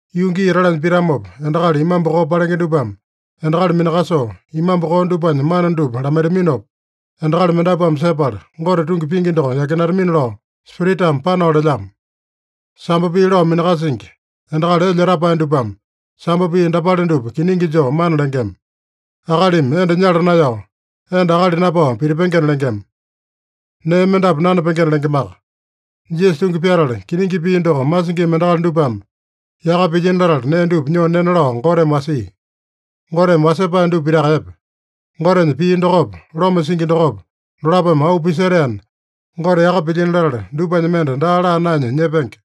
Yuu gii etalanya pitamopa, endakali imambu koo palenge dupame endakali minakasoo, imambu koo dupanya mana dupa lamaitaminopa, endakali mendapuame sepala, Gote tungi pingi doko yakinatamina lao Spiritame panao lelyamo. Sambo pii lao minakasingi, endakali elya etapae dupame, sambo pii dapale dupa kiningi joo mana lengema: Akalimi enda nyala naeyao, enda akali napao pitipengena lengema. Nee mendapu nanapengena lengemaka. Jisasa tungi pyatala, kiningi pii doko masingima endakali dupame yaka pilyino latala nee dupa nyoo nena lao Goteme wasia. Goteme wasepae dupa pitaka epe. Gotenya pii dokopa, loma singi dokopa, dolapome auu pisetaena, Gote yaka pilyino latala, dupanya mende daa laa naenya nyepenge.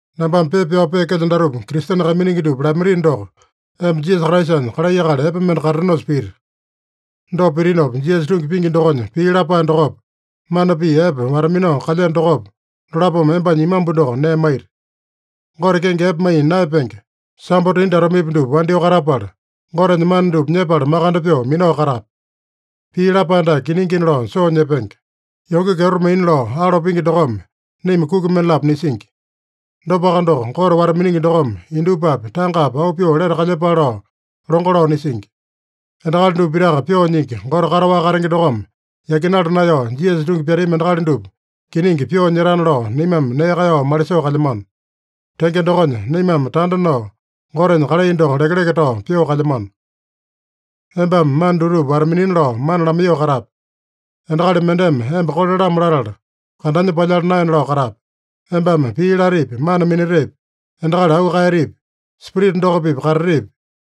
Nambame pepa pyao peekelyo datupa Kristene kaiminingi dupa lamaitino doko, emba Jisasa Kraisanya kalai akali epe mende katatenosa pita. Dopa pitinopa, Jisasa tungi pingi dokonya pii lapae dokopa, mana pii epe wata-minao kalyeno dokopa, dolapome embanya imambu doko nee maita. Gote kenge epe maiya naeyapenge, sambo tindi atomepi dupa wandyoo katapala, Gotenya mana dupa nyepala makande pyoo minao katape. Pii lapae dake kiningina lao soo nyepenge: Yonge kyeto maina lao alo pingi dokome naima kuki mendalapo nisingi. Dopaka doko, Gote wata-miningi dokome indupapi tangapi auu pyoo lete kalyepale lao longo lao nisingi. Endakali dupa pitaka Pyoo Nyingi Gote kataowaka katenge dokome yakinala naeyao, Jisasa tungi pyatami endakali dupa kiningi pyoo nyetana lao naimame nee kaeyao malisoo kalyamano. Tenge dokonya, naimame tanda nao Gotenya kalai doko lekeleke tao pyoo kalyamano. Embame mana dutupa wata-minina lao mana lamaiyoo katape. Endakali mendeme emba kole-lamo latala, kandanya palyala naena lao katape. Embame pii latepi, mana minatepi, endakali auu kaeyatepi, Spirita doko-pipa katatepi,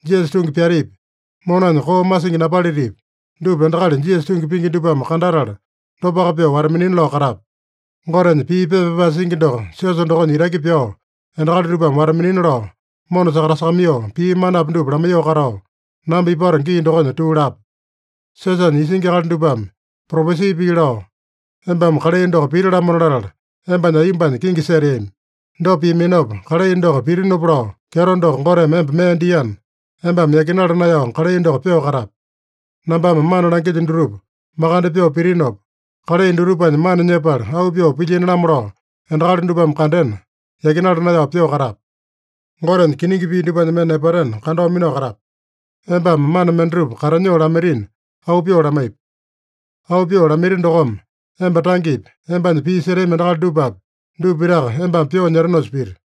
Jisasa tungi pyatepi, monanya koo masingi napalitipi, dupa endakali Jisasa tungi pingi dupame kandatala, dopaka pyoo wata-minina lao katape. Gotenya pii pepa pyapae singi doko siosa dokonya itaki pyao, endakali dupame wata-minina lao mona sakatasakamaiyoo, pii manapi dupa lamaiyoo katao, namba ipato gii dokonya tuu lape. Siosanya isingi akali dupame propesi pii lao, embame kalai doko piti-lamona latala, embanya aiyombanya kingi seteami. Dopa piaminopa, kalai doko pitinopa lao kyeto doko Goteme emba mee diana, embame yakinala naeyao kalai doko pyoo katape. Nambame mana langilyo dutupa makande pyoo pitinopa, kalai dutupanya mana nyepala auu pyoo pilyini-lamo lao endakali dupame kandena, yakinala naeyao pyoo katape. Gotenya kiningi pii dupanya mende nepatena, kandao minao katape. Embame mana mendatupa katanyoo lamaitina, auu pyoo lamaipi. Auu pyoo lamaiti dokome, emba tangepi, embanya pii setami endakali dupapi, dupa pitaka embame pyoo nyetenosa piti.